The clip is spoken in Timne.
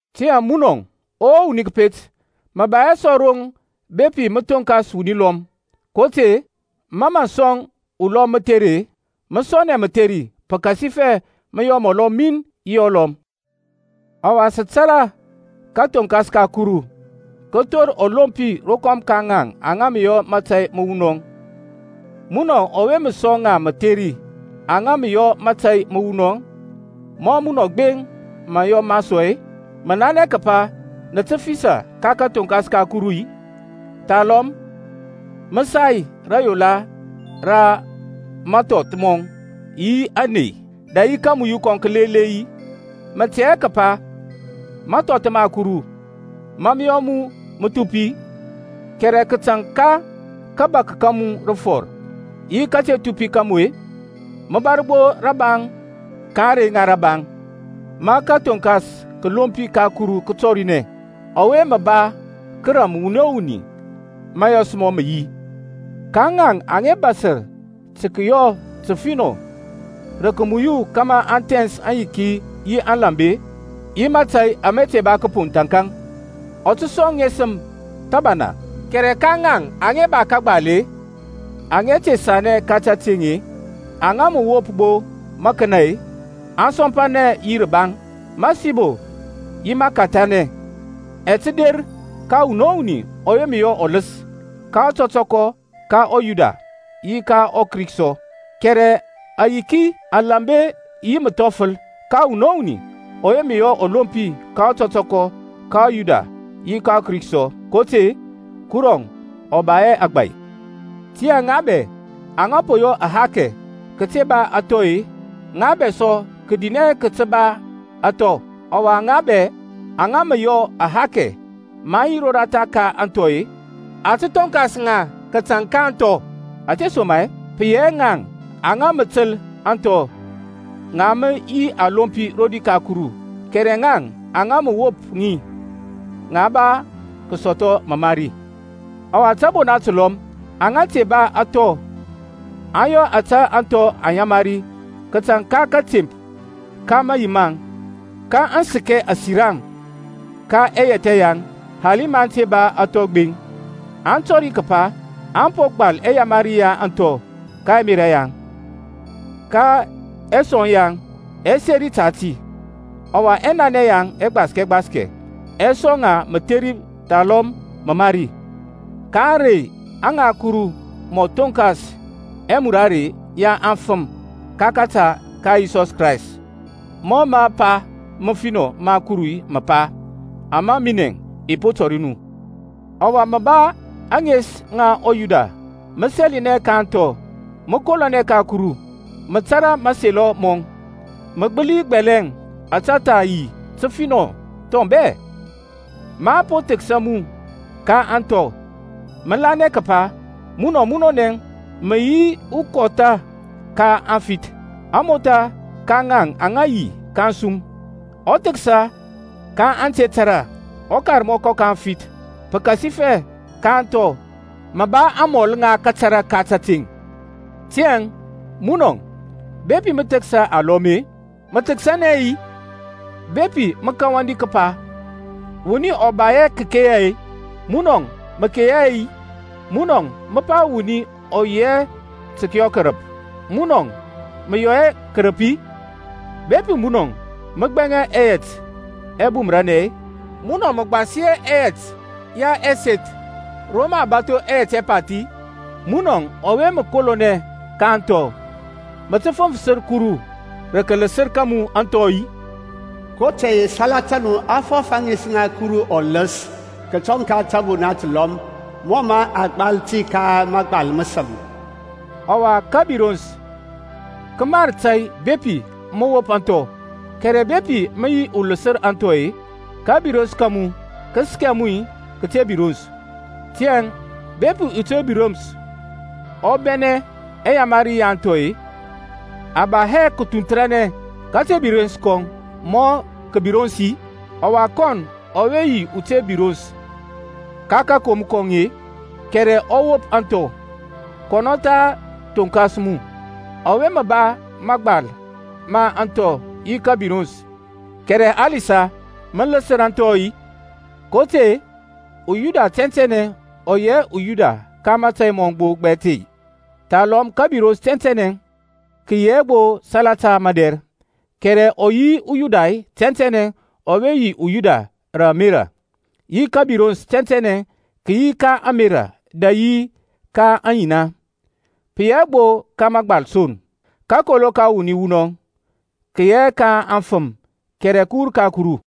Tiyȧŋ munɔ, O wuni kəpet, mə ba hɛ sɔ roŋ bepi mə thonkas wuni lɔm, kotȧy-e ma mə sɔŋ ulɔm mətheri-e, mə sɔnɛ mətheri, pəkasifɛ mə yɔ mɔlɔ min yi ɔlɔm. Ɔwa sə tȧrȧ kathoŋkas ka Kuru kə thor ɔlompi rokɔm ka ŋaŋ aŋa mə yɔ mȧtȧy məwunɔŋ. Munɔ ɔwe mə sɔŋ ŋa mətheri aŋa mə yɔ mȧtȧy məwunɔŋ, ma munɔ gbeŋ mə yɔ ma sɔ-e, mə nanɛ kəpa mə tə fisə ka kathoŋkas ka Kuru-i? Thalɔm mə sai rayola ra mathɔth mɔŋ yi ȧŋney dɛ yi kamuyu kɔŋ kəlele-i? Mə tɛ hɛ kəpa mathɔth ma Kuru mȧ mə yɔ mu mə thupi-i? Kɛrɛ kətaŋ ka kabak ka mu rəfɔr yi kate thupi ka mu-e, mə bȧr gbo rəbaŋ ka ȧŋrey ŋa rəbaŋ, ma kathoŋkas kəlompi ka Kuru kə tɔrinɛ; ɔwe mə ba kəram wuni o wuni mɔ mȧyɔs mɔŋ mə yi. Ka ŋaŋ aŋa bȧsər tə kəyɔ təfinɔ rə kəmuyu kȧmȧ aŋ thɛns ayiki yi alambe, yi mȧtȧy ama te ba kəpoŋ thȧnkȧŋ, ɔ tə sɔŋ aŋesəm thəbana, kɛrɛ ka ŋaŋ aŋa ba kəgbal-e, aŋa te sanɛ ka tateŋ-e, aŋa mə wop gbo mȧkənȧ-e, asɔmpanɛ yi rəbaŋ, məsibo yi məkɛthanɛ ɛ tə der ka wuni o wuni ɔwe mə yɔ ɔləs, ka ɔtɔtɔkɔ ka ɔYuda, yi ka ɔKrik sɔ, kɛrɛ ayiki, alambe yi məthɔfəl ka wuni o wuni ɔwe mə yɔ ɔlompi, ka ɔtɔtɔkɔ ka ɔYuda, yi ka ɔKrik sɔ. kotȧy-e Kuru ɔ ba hɛ agbȧy. Tiyȧŋ ŋa bɛ aŋa po yɔ ahakɛ kəte ba anthɔ-e, ŋa ba sɔ kədinɛ kəte ba ȧŋthɔ; ɔwa ŋa bɛ aŋa mə yɔ ahakɛ maŋ yi ratha ka anthɔ-e, a tə thonkas ŋa kətaŋ ka ȧŋthɔ. Ȧtesoma-e pə yi hɛ ŋaŋ aŋa mə təl ȧŋthɔ ŋa mə yi alompi rodi ka Kuru, kɛrɛ ŋaŋ aŋa mə wop ŋi, ŋa ba kəsɔthɔ məmari. Ɔwa tȧbona təlɔm aŋa te ba ȧŋthɔ aŋ yɔ ȧtȧ ȧŋthɔ aŋ yamari kətaŋ ka kȧtemp ka mayi maŋ, ka aŋ səkɛ asiraŋ ka ɛyɛthɛ yaŋ hali maŋ te ba ȧŋthɔ gbeŋ. Aŋ tɔri kəpa a po gbal ɛyamari ya ȧŋthɔ ka ɛmerȧ yaŋ, ka ɛsɔŋ yaŋ ɛ seri ta ti, ɔwa ɛnanɛ yaŋ ɛgbaskɛ gbaskɛ ɛ sɔŋ ŋa mətheri thalɔm məmari, ka ȧŋrey aŋa Kuru mɔ thonkas ɛmurare ya afəm ka kȧta ka Yisɔs Krayst, mɔ mə mapa məfinɔ ma Kuru mə pa, ama minɛ i po tɔri nu. Ɔwa mə ba ȧŋes ŋa uYuda, mə sɛlinɛ ka ȧŋthɔ, mə kolonɛ ka Kuru, mə tȧrȧ mȧselɔ mɔŋ, mə gbəli gbɛlɛŋ ȧtȧ tha yi təfinɔ thɔŋ bɛ, ma a po thəksa mu ka ȧŋthɔ. Mə lanɛ kəpa mun munɔnɛ mə yi ukɔtha ka aŋfith, amotha ka ŋaŋ aŋa yi ka ȧŋsum, uthəksa ka ante tȧrȧ, ukarmɔkɔ ka aŋfɛth, pəkasifɛ ka ȧŋthɔ mə ba amɔl ŋa kȧtȧrȧ ka tȧteŋ. Tiyȧŋ munɔ, bepi mə thəksa alɔm-e, mə thəksanɛ hɛ-i? Bepi mə kəwandi kəpa wuni ɔ ba hɛ kəkeya-e, munɔ mə keya hɛ-i? Munɔ mə pa wuni ɔ yi hɛ tə kəyɔ kərəp, munɔ mə yɔ hɛ kərəp-i? Bepi munɔ mə gbɛŋa ɛyɛt ɛbumərnɛ-e, munɔ mə gbasi hɛ ɛyɛt ya ɛseth ro mə a bȧtho ɛyɛt ɛpath-i? Munɔ ɔwe mə kolonɛ ka ȧŋthɔ, mə tə fəŋfərəs Kuru rə kaləsər ka mu anthɔ-i? kotȧy-e salata nu a fɔf ȧŋes ŋa Kuru ɔləs kətɔŋ ka tȧbona təlɔm, mɔ mȧ a gbal ti ka mȧgbal məsəm. Ɔwa kəbirons kə mar tȧy bepi mə wop ȧŋthɔ, kɛrɛ bepi mə yi uləsər anthɔ-e, kabirons ka mu kə səkɛ mu kəte birons. Tiyȧŋ bepi ute birons ɔ bɛnɛ ɛyamari ya anthɔ-e, a ba hɛ kəthunthanɛ kate birons kɔŋ mɔ kəbirons-i? Ɔwa kɔn ɔwe yi ute birons ka kakom kɔŋ-e, kɛrɛ ɔ wop ȧŋthɔ, kɔnɔ tha thonkas mu, ɔwe mə ba mȧgbal ma ȧŋthɔ yi kȧbirons, kɛrɛ halisa mə ləsər anthɔ-i? kotȧy-e uYuda tɛntɛnɛ ɔ yi hɛ uYuda ka mȧyɔs mɔŋ gbo gbɛt-e, thalɔm kəbirons tɛntɛnɛ kə yi hɛ gbo salata madɛr; kɛrɛ ɔ yi uYuda tɛntɛnɛ ɔwe yi uYuda rə ȧmerȧ, yi kəbirons tɛntɛnɛ kə yi ka ȧŋmerȧ dɛ yi ka aŋyina, pə yi hɛ gbo ka mȧgbal son. Kakolo ka wuni wunɔ kə yi hɛ ka afəm, kɛrɛ kə wur ka Kuru.